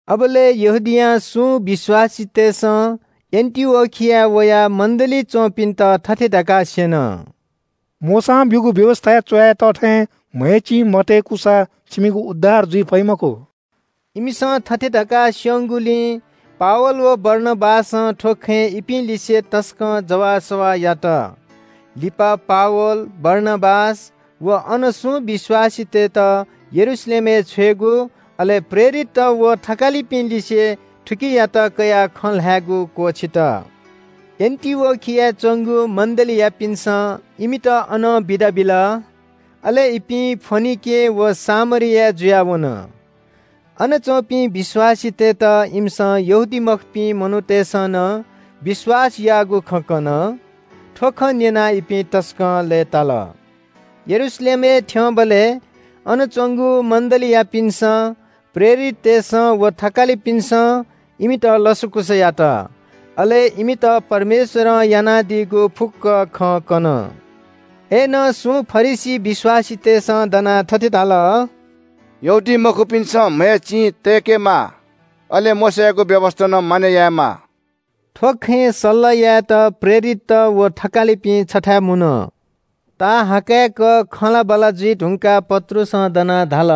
अबलय् यहूदियां सुं विश्‍वासीतय्‌सं एन्‍टिओखियाय् वयाः मण्‍डलीइ च्‍वंपिन्‍त थथे धकाः स्‍यन – “मोशां ब्‍यूगु व्‍यवस्‍थाय् च्‍वया तः थें म्‍हय् चिं मतय्‌कूसा छिमिगु उद्धार जुइ फइ मखु।” इमिसं थथे धकाः स्‍यंगुलिं पावल व बारनाबासं थ्‍व खँय् इपिं लिसे तसकं जवाःसवाः यात। लिपा पावल, बारनाबास व अनं सुं विश्‍वासीतय्‌त यरूशलेमय् छ्वयेगु, अले प्रेरितत व थकालिपिं लिसे थुकियात कयाः खँ ल्‍हायेगु क्‍वःछित। एन्‍टिओखियाय् च्‍वंगु मण्‍डलीयापिन्‍सं इमित अनं बिदा बिल। अले इपिं फोनिके व सामरिया जुयाः वन। अन च्‍वंपिं विश्‍वासीतय्‌त इमिसं यहूदीमखुपिं मनूतय्‌सं नं विश्‍वास याःगु खँ कन। थ्‍व खँ न्‍यनाः इपिं तसकं लय्‌ताल। यरूशलेमय् थ्‍यंबलय् अन च्‍वंगु मण्‍डलीयापिन्‍सं, प्रेरिततय्‌सं व थकालिपिन्‍सं इमित लसकुस यात। अले इमित परमेश्‍वरं यानादीगु फुक्‍क खँ कन। अय्‌नं सुं फरिसी विश्‍वासीतय्‌सं दनाः थथे धाल – “यहूदीमखुपिन्‍सं म्‍हय् चिं तय्‌केमाः, अले मोशायागु व्‍यवस्‍था नं मानय् यायेमाः।” थ्‍व खँय् सल्‍लाह यायेत प्रेरितत व थकालिपिं छथाय् मुन। ताःहाकय्‌क खँल्‍हाबल्‍हा जुइ धुंकाः पत्रुसं दनाः धाल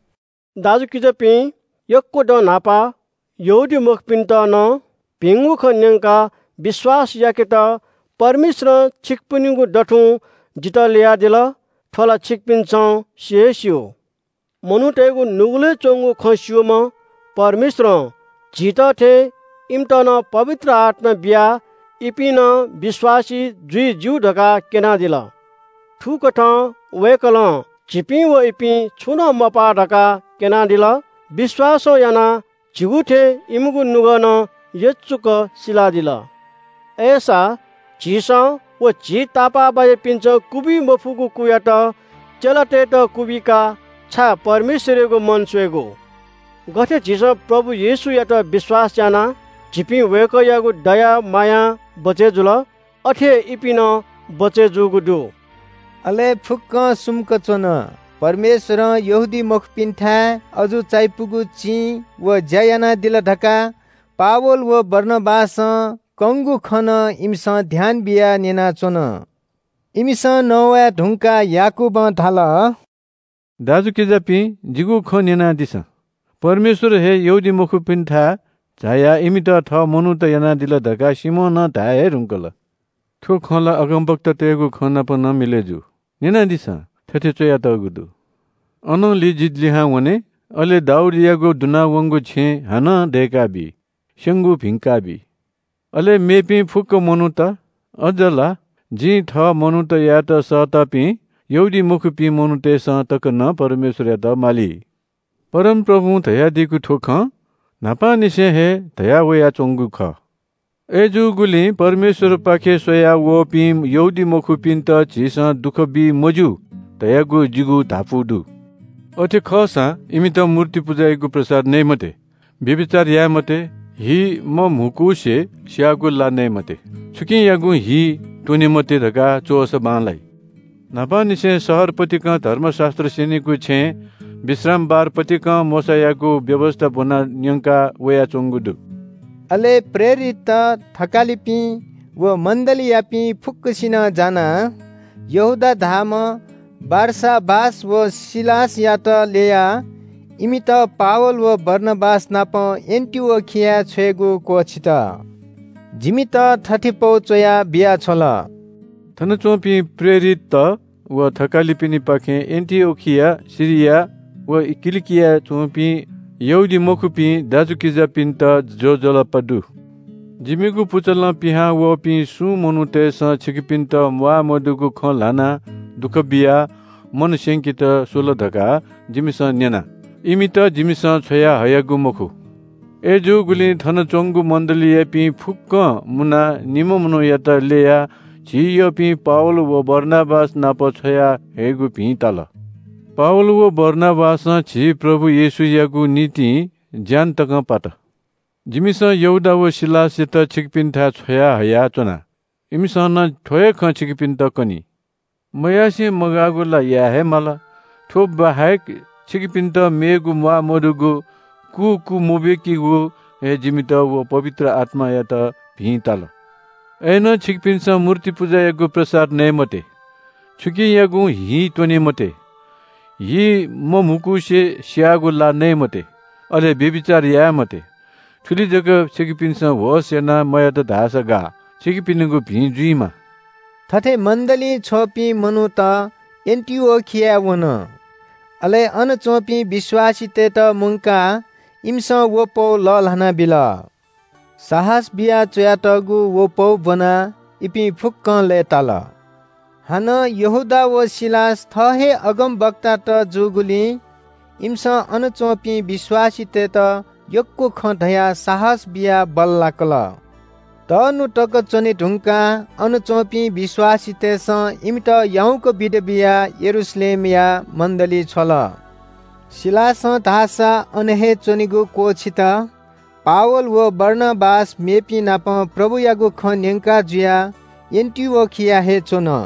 – “दाजुकिजापिं, यक्‍व दँ न्‍हापा यहूदीमखुपिन्‍त नं भिंगु खँ न्‍यंकाः विश्‍वास याकेत परमेश्‍वरं छिकपिनिगु दथुं जितः ल्‍ययादिल। थ्‍व ला छिकपिन्‍सं सि हे स्‍यू। मनूतय्‌गु नुगलय् च्‍वंगु खँ स्‍यूम्‍ह परमेश्‍वरं झीत थें इमित नं पवित्र आत्‍मा बियाः इपिं नं विश्‍वासी जुइ ज्‍यू धकाः क्‍यनादिल। थुकथं वय्‌कलं झीपिं व इपिं छुं नं मपाः धकाः क्‍यनादिल। विश्‍वासं यानाः झीगु थें इमिगु नुगः नं यचुक सिलादिल। अय्‌सा झीसं व झी तापाःबाज्‍यापिन्‍सं क्‍वबी मफुगु कुयात चेलातय्‌त क्‍वबिकाः छाय् परमेश्‍वरयागु मन स्‍वयेगु? गथे झीसं प्रभु येशूयात विश्‍वास यानाः झीपिं वय्‌कःयागु दया मायां बचय् जुल, अथे हे इपिं नं बचय् जूगु दु।” अले फुक्‍कं सुम्‍क च्‍वन। परमेश्‍वरं यहूदीमखुपिन्‍थाय् अजू चायापुगु चिं व ज्‍या यानादिल धकाः पावल व बारनाबासं कंगु खँ नं इमिसं ध्‍यान बियाः न्‍यनाच्‍वन। इमिसं नवाये धुंकाः याकूबं धाल – “दाजुकिजापिं, जिगु खँ न्‍यनादिसँ। परमेश्‍वर हे यहूदीमखुपिन्‍थाय् झायाः इमित थः मनूत यानादिल धकाः सिमोनं धाये हे धुंकल। थ्‍व खँ ला अगमवक्तातय्‌गु खँ नाप नं मिलय् जू। न्‍यनादिसँ, थथे च्‍वयातःगु दु – “‘अनंलि जि लिहां वने, अले दाऊदयागु दुना वंगु छेँ हानं दय्‌काबी। स्‍यंगु भिंका बी। अले मेपिं फुक्‍क मनूत, अज्‍ज ला जिं थः मनूत यायेत सःतापिं यहूदीमखुपिं मनूतय्‌सं तक नं परमेश्‍वरयात माली। परमप्रभुं धयादीगु थ्‍व खँ, न्‍हापांनिसें हे धयावयाच्‍वंगु खः।’” “अय्‌जूगुलिं परमेश्‍वरपाखे स्‍वया वःपिं यहूदीमखुपिन्‍त झीसं दुःख बी मज्‍यू धयागु जिगु धापू दु। अथे खःसां इमित मूर्ति पुजायागु प्रसाद नये मते, व्‍यभिचार याये मते, हि मम्‍हुकुसे स्‍याःगु ला नये मते, छुकियागुं हि त्‍वने मते धकाः च्‍वःसा बांलाइ। न्‍हापांनिसें शहर पतिकं धर्मशास्‍त्र स्‍यनीगु छेँय् विश्रामबार पतिकं मोशायागु व्‍यवस्‍था ब्‍वनाः न्‍यंका वयाच्‍वंगु दु।” अले प्रेरितत, थकालिपिं व मण्‍डलीयापिं फुक्‍कसिनं जानाः यहूदा धाःम्‍ह बारसाबास व सिलासयात ल्‍ययाः इमित पावल व बारनाबास नाप एन्‍टिओखियाय् छ्वयेगु क्‍वःछित। जिमित थथे पौ च्‍वया बियाछ्वल – “थनच्‍वंपिं प्रेरितत व थकालिपिनिपाखें एन्‍टिओखिया, सिरिया व किलिकियाय् च्‍वंपिं यहूदीमखुपिं दाजुकिजापिन्‍त ज्‍वजलपा दु। “जिमिगु पुचलं पिहांवःपिं सुं मनूतय्‌सं छिकपिन्‍त म्‍वाःमदुगु खँ ल्‍हानाः दुःख बियाः मन स्‍यंकेत स्‍वल धकाः जिमिसं न्‍यना। इमित जिमिसं छ्वयाहयागु मखु। अय्‌जूगुलिं थन च्‍वंगु मण्‍डलीयापिं फुक्‍कं मुनाः निम्‍ह मनूयात ल्‍ययाः झी यःपिं पावल व बारनाबास नाप छ्वयाहयेगु भिं ताल। पावल व बारनाबासं झी प्रभु येशूयागु निंतिं ज्‍यान तकं पात। जिमिसं यहूदा व सिलासयात छिकपिन्‍थाय् छ्वयाहया च्‍वना, इमिसं नं थ्‍व हे खँ छिकपिन्‍त कनी। “मयासें मगाःगु ला याये हे माल, थ्‍व बाहेक छिकपिन्‍त मेगु म्‍वाःमदुगु कु क्‍वमबीकेगु हे जिमित व पवित्र आत्‍मायात भिं ताल। अय्‌नं छिकपिन्‍सं मूर्ति पुजायागु प्रसाद नये मते, छुकियागुं हि त्‍वने मते, हि मम्‍हुकुसे स्‍याःगु ला नये मते, अले व्‍यभिचार याये मते। थुलि जक छिकपिन्‍सं होश यानाः मयात धाःसा गाः। छिकपिनिगु भिं जुइमा।” थथे मण्‍डलीं छ्वःपिं मनूत एन्‍टिओखियाय् वन। अले अन च्‍वंपिं विश्‍वासीतय्‌त मुंकाः इमिसं व पौ लःल्‍हाना बिल। साहस बियाः च्‍वयातःगु व पौ ब्‍वनाः इपिं फुक्‍कं लय्‌ताल। हानं यहूदा व सिलास थः हे अगमवक्तात जूगुलिं इमिसं अन च्‍वंपिं विश्‍वासीतय्‌त यक्‍व खँ धयाः साहस बियाः बल्‍लाकल। तःन्‍हु तक च्‍वने धुंकाः अन च्‍वंपिं विश्‍वासीतय्‌सं इमित याउँक बिदा बियाः यरूशलेमया मण्‍डली छ्वल। सिलासं धाःसा अन हे च्‍वनेगु क्‍वःछित। पावल व बारनाबास मेपिंनापं प्रभुयागु खँ न्‍यंका जुयाः एन्‍टिओखियाय् हे च्‍वन।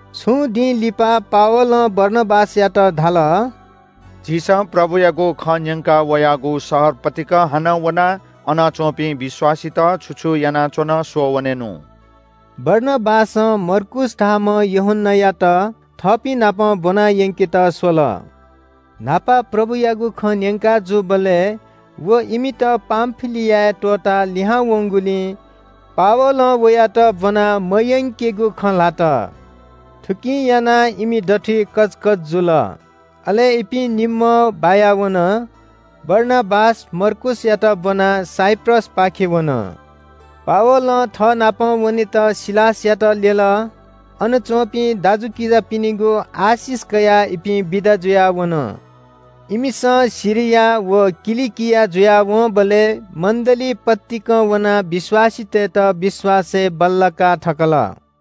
छुं दिं लिपा पावलं बारनाबासयात धाल – “झीसं प्रभुयागु खँ न्‍यंका वयागु शहर पतिकं हानं वनाः अन च्‍वंपिं विश्‍वासीत छु छु यानाच्‍वन स्‍वःवनेनु।” बारनाबासं मर्कूस धाःम्‍ह यूहन्‍नायात थःपिं नाप ब्‍वनायंकेत स्‍वल। न्‍हापा प्रभुयागु खँ न्‍यंका जूबलय् व इमित पामफिलियाय् त्‍वःताः लिहां वंगुलिं पावलं वयात ब्‍वना मयंकेगु खँ ल्‍हात। थुकिं यानाः इमि दथुइ कचकच जुल। अले इपिं निम्‍हं बायावन। बारनाबास मर्कूसयात ब्‍वनाः साइप्रसपाखे वन। पावलं थःनाप वनेत सिलासयात ल्‍यल। अन च्‍वंपिं दाजुकिजापिनिगु आशिष कयाः इपिं बिदा जुयाः वन। इमिसं सिरिया व किलिकिया जुयावंबलय् मण्‍डली पतिकं वनाः विश्‍वासीतय्‌त विश्‍वासय् बल्‍लाका थकल।